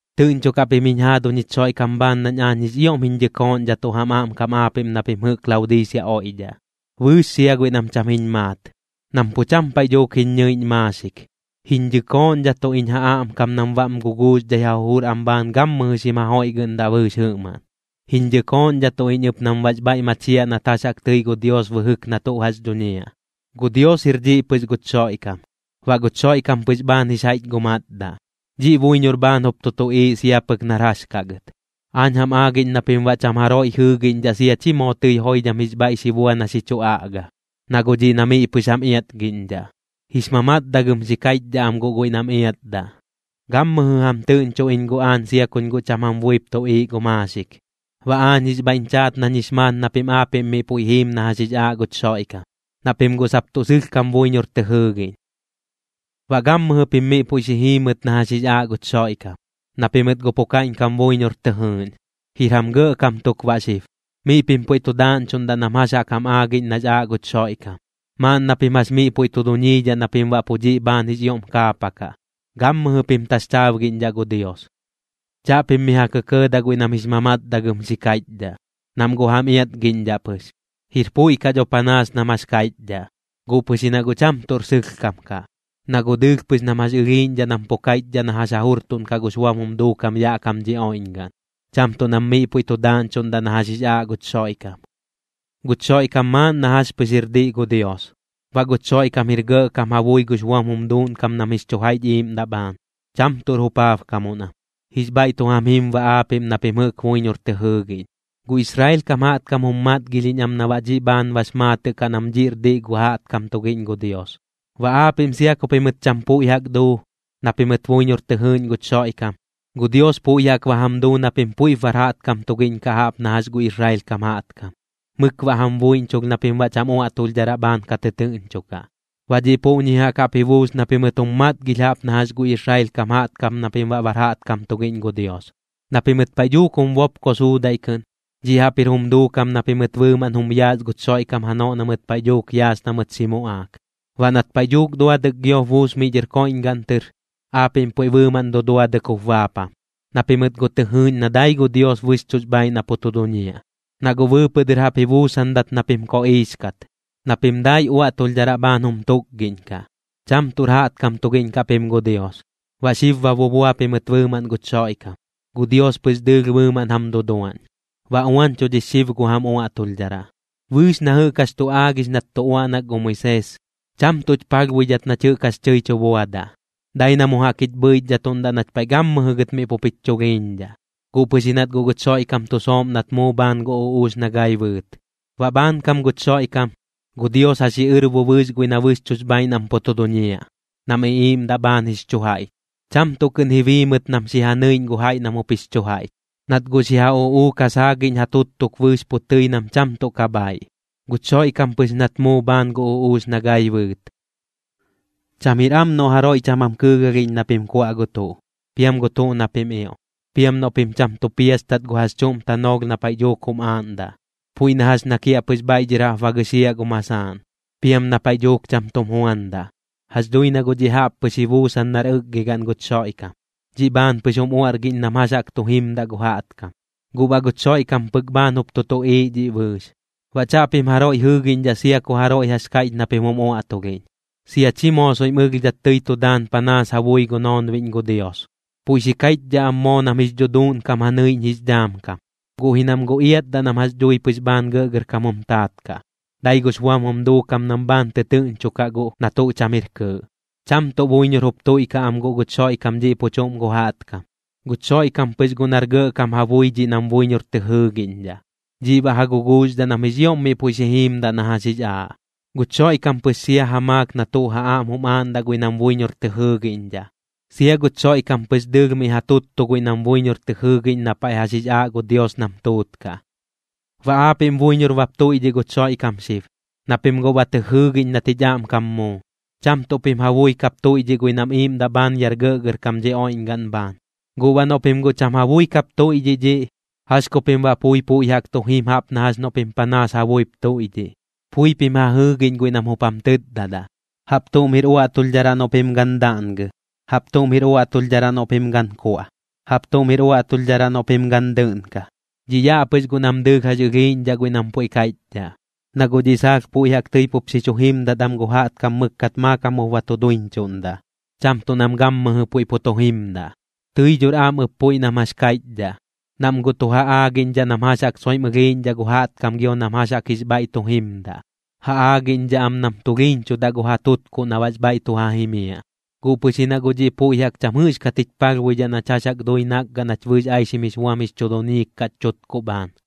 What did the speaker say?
Tɨꞌñchokaꞌ pim jiñ jaaduñ jich Xoiꞌkam bhaan nañ aañ jix ioꞌm jiñ dhɨkooꞌñdhatuꞌ jam aꞌmkam aapiꞌm na pim jɨꞌk Laodiisea oiꞌdhaꞌ, bɨɨx sia guiꞌ nam cham jiñ maat, nam pu cham paiꞌ dhuuk jiñ ñɨiꞌñ maaxik. Jiñ dhɨkooꞌñdhatuꞌ iñ ja aꞌmkam nam baꞌm guguuxdhai ja jujur am bhaan gammɨjɨ xim jajoiꞌgɨꞌndaꞌ bɨɨx jɨꞌmaꞌn. Jiñ dhɨkooꞌñdhatuꞌ iñ ɨp nam baꞌx bhaiꞌ machiaꞌ nat jax jaꞌk tɨi gu Dios bɨjɨk na tuꞌ jax dhuñiaꞌ. Gu Dios jir dhiꞌ pɨx guch Xoiꞌkam. Baꞌ guch Xoiꞌkam pɨx bhaan jix jaiꞌch gu matdaꞌ, dhiꞌ buiñor bhaan jup tu tuꞌiiꞌ sia pɨk nar jax kaꞌ gɨt. Aañ jam aagiꞌñ na pim baꞌ cham jaroiꞌ jɨɨgiꞌñdhaꞌ sia chi moo tɨi joidham jix bhaiꞌ xi bua na xi chu aꞌga. Na guꞌ dhiꞌ na miꞌ pɨx jam iatgiꞌñdhaꞌ, jix mamatdagɨm xi kaiꞌchdhaꞌ am guꞌ guiꞌ nam iatdaꞌ. Gammɨjɨ jam tɨꞌñcho iñ guꞌ aañ sia kuñ guꞌ cham jam buip tuꞌiiꞌ gu maaxik, baꞌ aañ jix bhaiꞌñ chaat nañ jix maat na pim aapiꞌm miꞌ puiꞌ jiim na jax jix aaꞌ guch Xoiꞌkam, na pim guꞌ sap tuꞌ sɨlhkam buiñor tɨ jɨɨgiꞌñ. Baꞌ gammɨjɨ pim miꞌ puiꞌ xi jiimɨt na jax jix aaꞌ guch Xoiꞌkam, na pimɨt guꞌ pu kaiꞌñkam buiñor tɨ jɨɨꞌñ. Jir jam gɇꞌkam tuk baꞌ xib. Miꞌ pim puiꞌ tu daaꞌñchuꞌndaꞌ nam jax jaꞌk jam aagiꞌñ nax aaꞌ guch Xoiꞌkam, maaꞌn na pim jax miꞌ puiꞌ tu duñiidhaꞌ na pim baꞌ pu dhiꞌ bhaan jix ioꞌm kaapakaꞌ. Gammɨjɨ pim taxchaabgiꞌñdhaꞌ gu Dios. Chaꞌpim mi ja kɇkɇɇdaꞌ guiꞌ nam jix mamatdagɨm xi kaiꞌchdhaꞌ, nam guꞌ jam iatgiꞌñdhaꞌ pɨx. Jir puiꞌ kaꞌ dho panaas nam jax kaiꞌchdhaꞌ, guꞌ pɨx ji na guꞌ cham tuꞌr sɨlhkam kaꞌ. Na guꞌ dɨɨlh pɨx nam jax ɨlhiiꞌñdhaꞌ nam pu kaiꞌchdhaꞌ na jax ja jurtuꞌnkaꞌ gux buam jum duukam yaꞌ kam dhi oiꞌñgaꞌn, cham tuꞌ nam miꞌ puiꞌ tu daaꞌñchuꞌndaꞌ na jax jix aaꞌ guch Xoiꞌkam. Guch Xoiꞌkam maaꞌn na jax pɨx jir diꞌ gu Dios. Baꞌ guch Xoiꞌkam jir gɇꞌkam ja bui gux buam jum duuꞌnkam nam jix chu jaiꞌch iiꞌmdaꞌ bhaan, cham tuꞌr jupaabkamuꞌn am. Jix bhaiꞌ tu jam jim baꞌ aapiꞌm na pim jɨꞌk buiñor tɨ jɨɨgiꞌñ. Gu Israel kam jaꞌtkam jum matgilhiꞌñ am na baꞌ dhiꞌ bhaan bax maatɨꞌ kaꞌ nam dhiꞌr diꞌ gu jaꞌtkam tugiꞌñ gu Dios. Baꞌ aapiꞌm sia ku pimɨt cham puiꞌ jaꞌk duu, na pimɨt buiñor tɨ jɨɨꞌñ guch Xoiꞌkam, gu Dios puiꞌ jaꞌk ba jam duu na pim puiꞌp bar jaꞌtkam tugiꞌñ kaꞌ jaꞌp na jax gu Israel kam jaꞌtkam. Mɨk baꞌ jam buiꞌñchulh na pim baꞌ cham uaꞌtulhdharaꞌ bhaan ka tɨtɨɨꞌñchokaꞌ, baꞌ dhiꞌ puꞌñi jaꞌk jaꞌp ji buus na pimɨt jum matgilh jaꞌp na jax gu Israel kam jaꞌtkam na pim baꞌ bar jaꞌtkam tugiꞌñ gu Dios. Na pimɨt paiꞌ dhuuk jum bopko suudaiꞌ kɨꞌn, dhiꞌ jaꞌp jir jum duukam na pimɨt bɨɨmaꞌn jum yaas guch Xoiꞌkam janoꞌ na mɨt paiꞌ dhuuk yaas na mɨt xi muꞌaak. Baꞌ nat paiꞌ dhuuk duadɨk giop buus miꞌ dhɨr koiꞌñgaꞌn tɨr, aapiꞌm puiꞌ bɨɨmaꞌn duduadɨk jup baapam, na pimɨt guꞌ tɨ jɨɨꞌñ na dai gu Dios bɨxchuꞌx bhaaiꞌ na pu tu duñiaꞌ. Na guꞌ bɨɨpɨꞌ dɨr jaꞌp ji buusandat na pim koꞌiix kat, na pim dai uaꞌtulhdharaꞌ bhaan jum tukgiꞌñkaꞌ, cham tuꞌr jaꞌtkam tugiꞌñ kaꞌ pim gu Dios. Baꞌ xib ba bubua pimɨt bɨɨmaꞌn guch Xoiꞌkam, gu Dios pɨx dɨɨlh bɨɨmaꞌn jam duduaꞌñ, ba uañchudhix xib gu jam uaꞌtulhdharaꞌ. Bɨɨx na jɨꞌk jax tu aagix nat tu uaꞌnak gu Moisees, cham tuꞌch palhbuidhat nach jɨꞌk jax tɨi chu buadaꞌ, dai na mu jaꞌk jich bhɨichdhatuꞌndat nach paiꞌ gammɨjɨ gɨt miꞌ pup jich chulhiiñdhaꞌ, guꞌ pɨx ji nat guꞌ guch Xoiꞌkam tu sooꞌm nat muu bhaan gu uꞌuux na gai bɨɨt. Baꞌ bhaankam guch Xoiꞌkam, gu Dios ja xiꞌɨrbo bɨɨx guiꞌ na bɨxchuꞌx bhaaiꞌ nam pu tu duñiaꞌ, nam iꞌiiꞌmdaꞌ bhaan jix chu jaiꞌch. Cham tuꞌ kɨꞌn ji bii mɨt nam xi ja nɨiꞌñ gu jaiꞌ nam jup jix chu jaiꞌch, nat guꞌ xi ja uꞌuuk ja saagiꞌñ ja tuttuk bɨɨx pu tɨi nam cham tuꞌ ka bhaaiꞌ, guch Xoiꞌkam pɨx nat muu bhaan gu uꞌuux na gai bɨɨt. Cham jir am noꞌ jaroiꞌ cham jam kɨɨgalhiꞌñ na pim kuaꞌ gu tuꞌ, piam gu tuꞌ na pim ioꞌ, piam noꞌ pim cham tu piastat gu jax chuꞌm tanoolh na paiꞌ dhuuk jum aaꞌndaꞌ, puiꞌ na jax na kiaꞌpɨx bhaiꞌ dhɨr jaꞌp ba gɨxiaꞌ gu masaaꞌn, piam na paiꞌ dhuuk cham tum juandaꞌ. Jax dhui na guꞌ dhiꞌ jaꞌp pɨx ji buusan nar ɨkgigaꞌn guch Xoiꞌkam, dhiꞌ bhaan pɨx jum uaꞌrgiꞌñ nam jax jaꞌk tu jimdaꞌ gu jaꞌtkam. Guꞌ baꞌ guch Xoiꞌkam pɨk bhaan jup tu tuꞌiiꞌ dhiꞌ bɨɨx. Baꞌ chaꞌpim jaroiꞌ jɨɨgiꞌñdhaꞌ sia ku jaroiꞌ jax kaiꞌch na pim jum uaꞌtulhiꞌñ, sia chi moo soiꞌm ɨlhdhat tɨi tu daan panaas ja bui gu noonbiꞌñ gu Dios. Puiꞌ xi kaiꞌchdhaꞌ am moo nam jix dhuduuꞌnkam ja nɨiꞌñ jix dhaam kam, guꞌ ji nam guꞌ iatdaꞌ nam jax dhui pɨx bhaan gɇꞌgɇrkam jum taat kaꞌ, dai gux buam jum duukam nam bhaan tɨtɨɨꞌñchokaꞌ guꞌ na tuꞌ cham jir kɨɨꞌ. Cham tuꞌ buiñor jup tuiꞌkaꞌ am guꞌ guch Xoiꞌkam dhiꞌ pu chuꞌm gu jaꞌtkam, guch Xoiꞌkam pɨx guꞌ nar gɇꞌkam ja bui dhiꞌ nam buiñor tɨ jɨɨgiꞌñdhaꞌ, dhiꞌ baꞌ ja guguuxdhaꞌ nam jix ioꞌm miꞌ puiꞌ xi jiimdaꞌ na jax jix aaꞌ. Guch Xoiꞌkam pɨx sia ja maak na tuꞌ ja aꞌm jum aaꞌndaꞌ guiꞌ nam buiñor tɨ jɨɨgiꞌñdhaꞌ, sia guch Xoiꞌkam pɨx dɨɨlh miꞌ ja tuttuꞌ guiꞌ nam buiñor tɨ jɨɨgiꞌñ na paiꞌ jax jix aaꞌ gu Dios nam tuutkaꞌ. Baꞌ aapiꞌm buiñor bap tuiꞌdhiꞌ guch Xoiꞌkam xib, na pim guꞌ ba tɨ jɨɨgiꞌñ nat jich aꞌmkam muu, cham tuꞌ pim ja bui kap tuiꞌdhiꞌ guiꞌ nam iiꞌmdaꞌ bhaan yaꞌr gɇꞌgɇrkam dhi oiꞌñgaꞌn bhaan. Gu baꞌ noꞌ pim guꞌ cham ja bui kap tuiꞌdhiꞌ dhiꞌ, ¿jax ku pim baꞌ pui puiꞌ jaꞌk tu jim jaꞌp na jax noꞌ pim panaas ja buip tuiꞌdhiꞌ? Pui pim ja jɨɨgiꞌñ guiꞌ nam jup jam tɨtdadaꞌ: “Jaꞌp tuꞌm jir uaꞌtulhdharaꞌ noꞌ pim gan daꞌngɨ. Jaꞌp tuꞌm jir uaꞌtulhdharaꞌ noꞌ pim gan kuaꞌ. Jaꞌp tuꞌm jir uaꞌtulhdharaꞌ noꞌ pim gan dɨꞌnka.” Dhiꞌ yaꞌ pɨx guꞌ nam dɨɨlh jax ɨlhiiꞌñdhaꞌ guiꞌ nam puiꞌ kaiꞌchdhaꞌ, na guꞌ dhiꞌ saalh puiꞌ jaꞌk tɨi pup xi chu jimdat am gu jaꞌtkam mɨkkat maakam jup ba tu duiñchuꞌndaꞌ, cham tuꞌ nam gammɨjɨ puiꞌ pu tu jimdaꞌ. Tɨi dhor am ɨp puiꞌ nam jax kaiꞌchdhaꞌ, nam guꞌ tu ja aagiꞌñdhaꞌ nam jax jaꞌk soiꞌm ɨlhiiꞌñdhaꞌ gu jaꞌtkam gio nam jax jaꞌk jix bhaiꞌ tu jimdaꞌ. Ja aagiꞌñdhaꞌ am nam tulhiiñchudaꞌ gu ja tutkuꞌ na baꞌx bhaiꞌ tu ja jimiaꞌ, guꞌ pɨx ji na guꞌ dhiꞌ puiꞌ jaꞌk cham jɨꞌxkat jich palhbuidhaꞌ nach jax jaꞌk dui nakgaꞌ nach bɨɨx aixim jix buam jix chu duñiik kaꞌch chutkuꞌ bhaan.